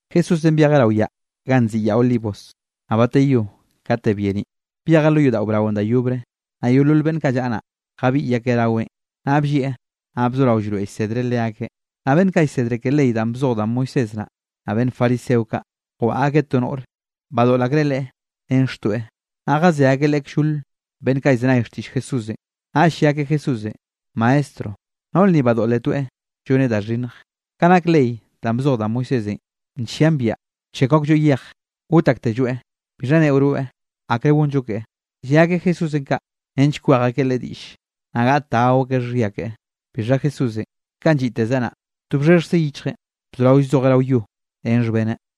Jesúsenꞌ byejeꞌ rao yaꞌ ganꞌ nziꞌi Yaꞌ Olivos. Naꞌ bateyó kate byeniꞌ, byejeꞌ lo yodaꞌo braonꞌ da yobre, naꞌ yeolol beꞌnn kaꞌ llaꞌa naꞌ, jabiꞌy akeꞌ raweꞌn. Naꞌ bllieꞌ naꞌ bzoraweꞌ llroeꞌ llsedreꞌ leakeꞌ. Naꞌ beꞌnn kaꞌ llsedre ke ley danꞌ bzoj da Moisés naꞌ, naꞌ beꞌnn fariseo kaꞌ, jwaꞌa akeꞌ to noꞌre, badoꞌl akreꞌ leꞌe ren xtoeꞌ. Naꞌ jazé akeꞌ leꞌe kllol beꞌnn kaꞌ llzenay xtiꞌll Jesúsenꞌ. Naꞌll lle akeꞌ Jesúsenꞌ: —Maestro, noꞌr ni badoꞌletoeꞌ lloneꞌ da xhinnj. Ka nak ley danꞌ bzoj da Moisésenꞌ, nllian biaꞌa wchekw aklloeꞌ yej got aktelloeꞌ. ¿Bixha neꞌo rweꞌ, akre gonllo keꞌe? Lle akeꞌ Jesúsenꞌ kaꞌ, nench wkwej akeꞌ Leꞌe diꞌll, naꞌ gaꞌt da gao akeꞌ xhia keꞌe. Bixha Jesúsenꞌ kanꞌ lliꞌteze naꞌ, to bxhexjze yichjeꞌn bzoraweꞌ llzojeꞌ rao yo ren xhbeneꞌ.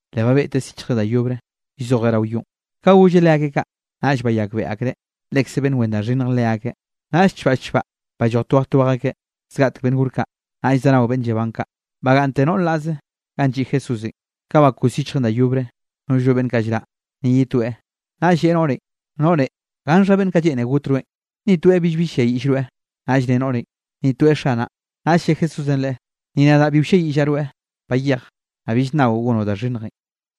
Le babeꞌteꞌ syichjre da yobre, llzojeꞌ rao yonꞌ. Ka golleꞌ leakeꞌ kaꞌ, naꞌll bayakbeꞌe akreꞌ, lekze beꞌnn wen da xhinnj leakeꞌ, naꞌll chbaꞌ chbaꞌ balloj twej twej akeꞌ, zgaꞌtek beꞌnn gore kaꞌ, naꞌll zanao beꞌnn llaban kaꞌ, bagaꞌnnte noꞌr naꞌze ganꞌ lliꞌ Jesúsenꞌ. Ka bakos yichjeꞌn da yobre, nollno beꞌnn kaꞌ llraꞌ, ni ye toeꞌ, naꞌll lleꞌe noꞌrenꞌ: —Noꞌre, ¿gannxha beꞌnn kaꞌ lleꞌne got rweꞌn? ¿Ni toeꞌ billbi ll-lliayiꞌll rweꞌ? Naꞌll ne noꞌrenꞌ: —Ni toeꞌ, Xanaꞌ. Naꞌll lle Jesúsenꞌ leꞌe: —Ni nadaꞌ bi wlliayiꞌllaꞌ rweꞌ. Bayej, naꞌ bill nnaoꞌ gonoꞌ da xhinnjenꞌ.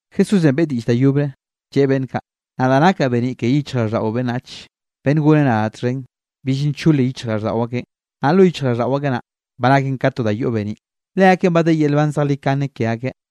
Jesúsenꞌ beꞌe diꞌll da yobre, lleꞌe beꞌnn kaꞌ: —Nadaꞌ nakaꞌ beniꞌ ke yichjraꞌlldaꞌo beꞌnnach. Beꞌnn goneꞌ nadaꞌ txhen, bill nchole yichjraꞌlldaꞌo akeꞌn, naꞌ lo yichjraꞌlldaꞌo akeꞌ naꞌ, ba naken ka to da yoꞌ beniꞌ. Leakeꞌn ba de yel nban zejlikane ke akeꞌ.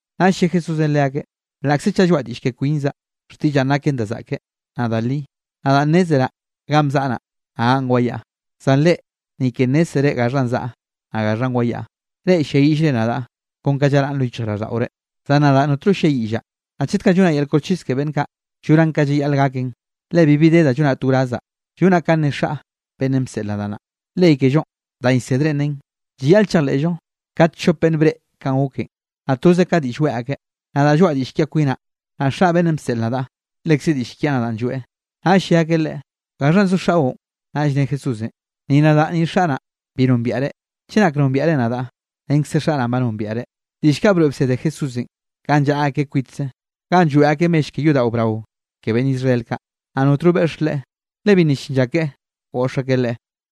Naꞌll lle Jesúsenꞌ leakeꞌn: —Laꞌkze chaꞌ lloaꞌa diꞌll ke kwinzaꞌ, xtiꞌllaꞌn naken da zaꞌke, naꞌ da li. Nadaꞌ nnezraꞌ ganꞌ bzaꞌa naꞌ, naꞌ ganꞌ wayaꞌa, zan reꞌ ni ke nnézzere gaxhanꞌ zaꞌa, naꞌ gaxhanꞌ wayaꞌa. Reꞌ ll-lliayiꞌllre nadaꞌ kon ka llaraꞌn lo yichjraꞌlldaꞌore, zan nadaꞌ notno ll-lliayiꞌllaꞌ. Naꞌ chet kaꞌ llonaꞌ yel koxchis ke beꞌnn kaꞌ, llonaꞌn ka llayaꞌl gaken, le bibi de da llonaꞌ to wrazzaꞌ, llonaꞌ kanꞌ ne Xaꞌ beꞌnnenꞌ bseꞌl nadaꞌ naꞌ. Ley kellonꞌ danꞌ llsedrenꞌ nen, llayaꞌl chejleꞌllo kat chope beꞌnn breꞌe kanꞌ goken, naꞌ toze ka diꞌll weꞌe akeꞌ. Nadaꞌ lloaꞌa diꞌll kiaꞌ kwinaꞌ, naꞌ Xaꞌ beꞌnnenꞌ bseꞌl nadaꞌ, lekze diꞌll kiaꞌ nadaꞌn lloeꞌ. Naꞌll lle akeꞌ Leꞌe: —¿Gaxhanꞌ zo xaꞌo? Naꞌll ne Jesúsenꞌ: —Ni nadaꞌ ni Xaꞌ naꞌ, bi nombiaꞌre. Chenak nombiaꞌre nadaꞌ, renkze Xaꞌ naꞌ, ba nombiaꞌre. Diꞌll kaꞌ broeꞌ bsede Jesúsenꞌ, kanꞌ llaꞌa akeꞌ kwitze ganꞌ lloeꞌ akeꞌ mell ke yodaꞌo brao ke beꞌnn Israel kaꞌ. Naꞌ notno beꞌx Leꞌe, le bi nna llin lla keꞌe goꞌx akeꞌ Leꞌe.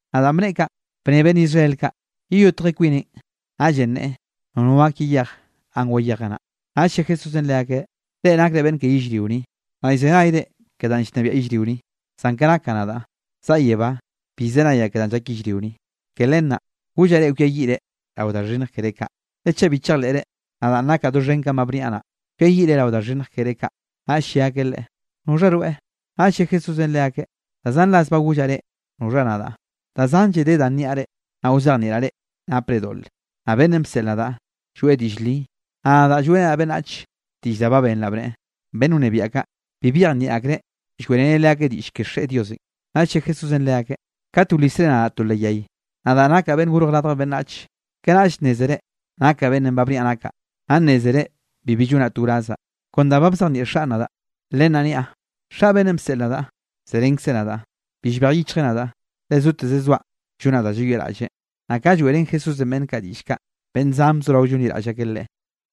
Naꞌ danꞌ bneꞌe kaꞌn, bne beꞌnn Israel kaꞌ: —¿Yeyotje kwineꞌn, naꞌllenꞌ neꞌe nono gak yeyej ganꞌ wayejeꞌ naꞌ? Naꞌll lle Jesúsenꞌ leakeꞌ: —Reꞌ nakre beꞌnn ke yellrio ni, naꞌ llzenayre ke danꞌ llnebiaꞌ yellrio ni, zan ke nak nadaꞌ, zaꞌa yebá bi llzenayaꞌ ke danꞌ llak yellrio ni. Ke len naꞌ, gollaꞌ reꞌ kwiayiꞌre rao da xhinnj keré kaꞌ. Le chaꞌ bi chejleꞌre nadaꞌn nakaꞌ doxhen kanꞌ ba bniaꞌ naꞌ, kwiayiꞌre rao da xhinnj keré kaꞌ. Naꞌll lle akeꞌ Leꞌe: —¿Noxha rweꞌ? Naꞌll lle Jesúsenꞌ leakeꞌ: —Da zan ras ba gollaꞌ reꞌ noxha nadaꞌ. Da zanlle de da nniaꞌ reꞌ, naꞌ wzejnieꞌraꞌ reꞌ napre doꞌle. Naꞌ beꞌnnenꞌ bseꞌl nadaꞌ, lloeꞌ diꞌll li, naꞌ nadaꞌ lloeꞌrenaꞌ beꞌnnach diꞌll da ba benraꞌ bneꞌe. Beꞌnn wnebiaꞌ kaꞌ, bi byejnieꞌ akreꞌ lloeꞌreneꞌ leakeꞌ diꞌll ke Xeꞌe Diosenꞌ. Naꞌll lle Jesúsenꞌ leakeꞌ: —Kat wlisre nadaꞌ to leꞌ yay, nadaꞌ nakaꞌ Beꞌnn Gorj Radj Beꞌnnach, kanaꞌll nnézere nakaꞌ beꞌnnenꞌ ba bniaꞌ nakaꞌ, naꞌ nnézere bibi llonaꞌ to wrazaꞌ, kon da ba bzejnieꞌ Xaꞌn nadaꞌ, len naꞌ niaꞌ. Xaꞌ beꞌnnenꞌ bseꞌl nadaꞌ, zerenkzeꞌ nadaꞌ. Bi llbej yichjeꞌ nadaꞌ, le zoteze zoaꞌ llonaꞌ da llayoꞌraꞌlleꞌ. Naꞌ ka lloeꞌrén Jesúsenꞌ beꞌnn kaꞌ diꞌll kaꞌ, beꞌnn zan bzorao llonliraꞌll akeꞌ Leꞌe.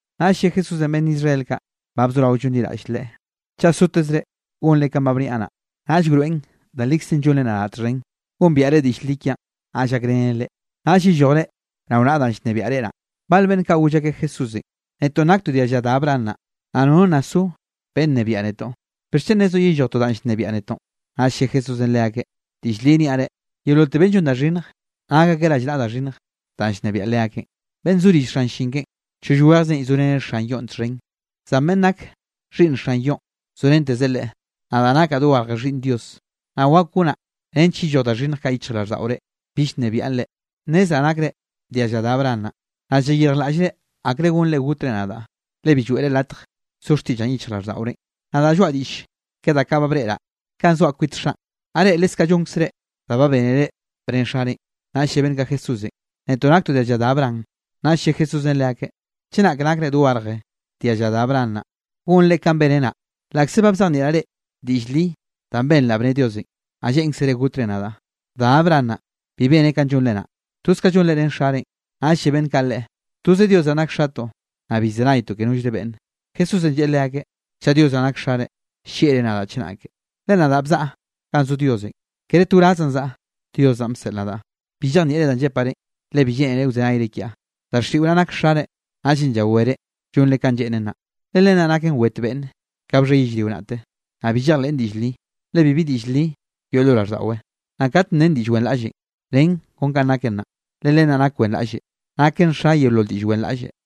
Naꞌll lle Jesúsenꞌ beꞌnn Israel kaꞌ ba bzorao llonliraꞌll Leꞌe: —Chaꞌ sotezre gonre kanꞌ ba bniaꞌ naꞌ, naꞌll wroeꞌn da likzenꞌ llonre nadaꞌ txhen. Gombiaꞌre diꞌll li kiaꞌn, naꞌll gakrenen reꞌ, naꞌll yellojre rao naꞌa danꞌ llnebiaꞌ reꞌ naꞌ. Bale beꞌnn kaꞌ, goll akeꞌ Jesúsenꞌ: —Netoꞌn naktoꞌ dialla da Abraham naꞌ, naꞌ nono nna so beꞌnn nnebiaꞌ netoꞌ. ¿Bixchen nezoꞌ yellojtoꞌ danꞌ llnebiaꞌ netoꞌ? Naꞌ lle Jesúsenꞌ leakeꞌ: —Diꞌll li niaꞌ reꞌ, yeololte beꞌnn llon da xhinnje, nak akeꞌ rallnaꞌa da xhinnj danꞌ llnebiaꞌ leakeꞌn. Beꞌnn zo rill xan llin keꞌen, choll wejze llzoreneꞌ xan yoꞌn txhen, zan beꞌnn nak xhiꞌnn xan yoꞌn zorentezeꞌ leꞌe. Nadaꞌ nakaꞌ dogarje Xhiꞌnn Dios, naꞌ wak gonaꞌ nench yelloj da xhinnj kaꞌ yichjraꞌlldaꞌorenꞌ, bill nnebiaꞌn reꞌ. Nnezraꞌ nakre dialla da Abraham naꞌ, naꞌ llayirjlaꞌllre akre gonre gotre nadaꞌ, le bi lloeꞌre latj so xtiꞌllaꞌn yichjraꞌlldaꞌorenꞌ. Nadaꞌ lloaꞌa diꞌll ke da kaꞌ ba breꞌraꞌ kanꞌ zoaꞌ kwit Xaꞌn, naꞌ reꞌ leskaꞌ llonkzre da ba bénere bne xarenꞌ. Naꞌll lle beꞌnn kaꞌ Jesúsenꞌ: —Netoꞌ naktoꞌ dialla da Abraham. Naꞌll lle Jesúsenꞌ leakeꞌ: —Chenak nakre dogarje dialla da Abraham naꞌ, gonre kanꞌ beneꞌ naꞌ. Laꞌkze ba bzejnieꞌraꞌ reꞌ diꞌll li danꞌ benraꞌ bne Diosenꞌ, naꞌ lleꞌnkzere gotre nadaꞌ. Da Abraham naꞌ, bi beneꞌ kanꞌ llonre naꞌ. Toz kaꞌ llonre ren xarenꞌ. Naꞌll lle beꞌnn kaꞌ Leꞌe: —Toze Dios naꞌn nak xatoꞌ, naꞌ bi llzenaytoꞌ ke nollre beꞌnne. Jesúsenꞌ lleꞌe leakeꞌ: —Chaꞌ Dios naꞌ nak xare, llieꞌre nadaꞌ chenake, le nadaꞌn bzaꞌa ganꞌ zo Diosenꞌ. Kere to wrazzaꞌn zaꞌa, Dios naꞌn bseꞌl nadaꞌ. Bi llejnieꞌre danꞌ llepaꞌ reꞌn, le bi lleꞌnere wzenayre kiaꞌ. Daxiꞌo naꞌ, nak xare, naꞌllenꞌ llawere llonre kanꞌ lleꞌnen naꞌ. Le len naꞌ naken wet beꞌnne, kanꞌ bxhe yellrio naꞌte. Naꞌ bi llejleꞌn diꞌll li, le bibi diꞌll li yoꞌ lo raꞌlldaꞌwe. Naꞌ kat nen diꞌll wenraꞌlle, nen kon kanꞌ naken naꞌ, le len naꞌ nak wenraꞌlle, naken xa yeolol diꞌll wenraꞌlle.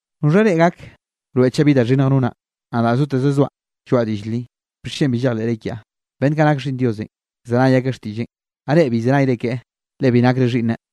¿Noxha reꞌ gak wroeꞌ chaꞌ bi da xhinnj nonaꞌ? Nadaꞌ zoteze zoaꞌ lloaꞌa diꞌll li. ¿Bixchen bi llejleꞌre kiaꞌ? Beꞌnn kaꞌ nak xhiꞌnn Diosenꞌ, llzenay akeꞌ xtiꞌlleꞌn. Naꞌ reꞌ bi llzenayre keꞌe, le bi nakre xhiꞌnneꞌ.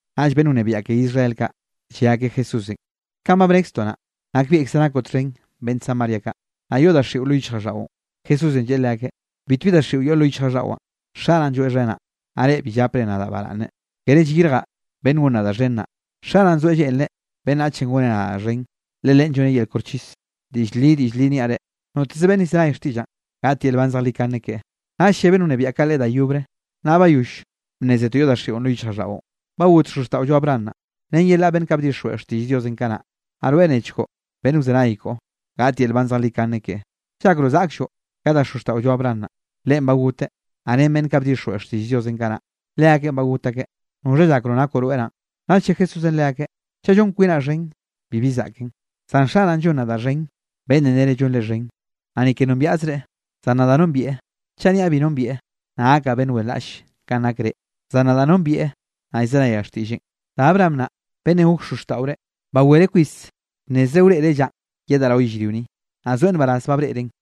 Naꞌll beꞌnn wnebiaꞌ ke Israel kaꞌ, lle akeꞌ Jesúsenꞌ: —Kanꞌ ba bnekztoꞌ naꞌ, nakbieꞌkze nakoꞌ txhen beꞌnn Samaria kaꞌ, naꞌ yoꞌ daxiꞌo lo yichjraꞌlldaꞌon. Jesúsenꞌ lleꞌe leakeꞌ: —Bitbi daxiꞌo yoꞌ lo yichjraꞌlldaꞌwaꞌn, Xaꞌ naꞌ lloeꞌxhenaꞌ, naꞌ reꞌ bi llapre nadaꞌ baraꞌnne. Kere llyirjaꞌ beꞌnn gon nadaꞌ xhen naꞌ, Xaꞌ naꞌn zoeꞌ lleꞌnreꞌ beꞌnnache goneꞌ nadaꞌ xhen, le Leꞌen lloneꞌ yel koxchis. Diꞌll li, diꞌll li niaꞌ reꞌ: Noteze beꞌnn llzenay xtiꞌllaꞌn, gaꞌt yel nban zejlikane keꞌe. Naꞌll lle beꞌnn wnebiaꞌ kaꞌ Leꞌe da yobre: —Naꞌ bayoll bnnézetoꞌ yoꞌ daxiꞌon lo yichjraꞌlldaꞌon. Ba got xozxtaꞌollo Abraham naꞌ, ren yelaꞌ beꞌnn kaꞌ bdixjweꞌ xtiꞌll Dios kanaꞌ, naꞌ rweꞌ nechkoꞌ beꞌnn wzenay koꞌo, gaꞌt yel nban zejlikane keꞌe. ¿Llakroꞌ zaꞌklloꞌ ka da xozxtaꞌollo Abraham naꞌn? Leꞌen ba goteꞌ, naꞌ ren beꞌnn kaꞌ bdixjweꞌ xtiꞌll Diosenꞌ kanaꞌ, leakeꞌn ba got akeꞌ. ¿Noxha llakroꞌ nakoꞌ rweꞌ naꞌn? Naꞌll lle Jesúsenꞌ leakeꞌ: —Chaꞌ llon kwinaꞌ xhen, bibi zaꞌken, zan Xaꞌn llon nadaꞌ xhen beꞌnnenꞌ nere llonre xhen. Naꞌ ni ke nombiaꞌzreꞌ, zan nadaꞌ nombieꞌ. Chaꞌ niaꞌ bi nombieꞌ, naꞌ gakaꞌ beꞌnn wenraꞌll kanꞌ nak reꞌ. Zan nadaꞌ nombieꞌ, naꞌ llzenayaꞌ xtiꞌlleꞌn. Da Abraham naꞌ, beꞌnnenꞌ gok xozxtaꞌore, bawereꞌ kwis bnnezreꞌ wreꞌreꞌ llanꞌ yedaꞌ rao yellrio ni, naꞌ zoeꞌ nbaraz ba breꞌreꞌn.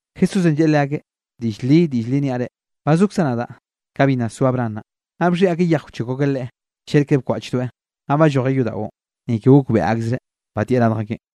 Jesúsenꞌ lleꞌe leakeꞌ: —Diꞌll li, diꞌll li niaꞌ reꞌ: Ba zokzaꞌ nadaꞌ ka bi nna so Abraham naꞌ. Naꞌ bxhiꞌi akeꞌ yej wchekw akeꞌ Leꞌe, cheꞌr ke bkwaꞌchdoeꞌ, naꞌ ballojeꞌ yodaꞌon. Ni ke gokbeꞌe akzreꞌ, badieꞌ radj akeꞌn.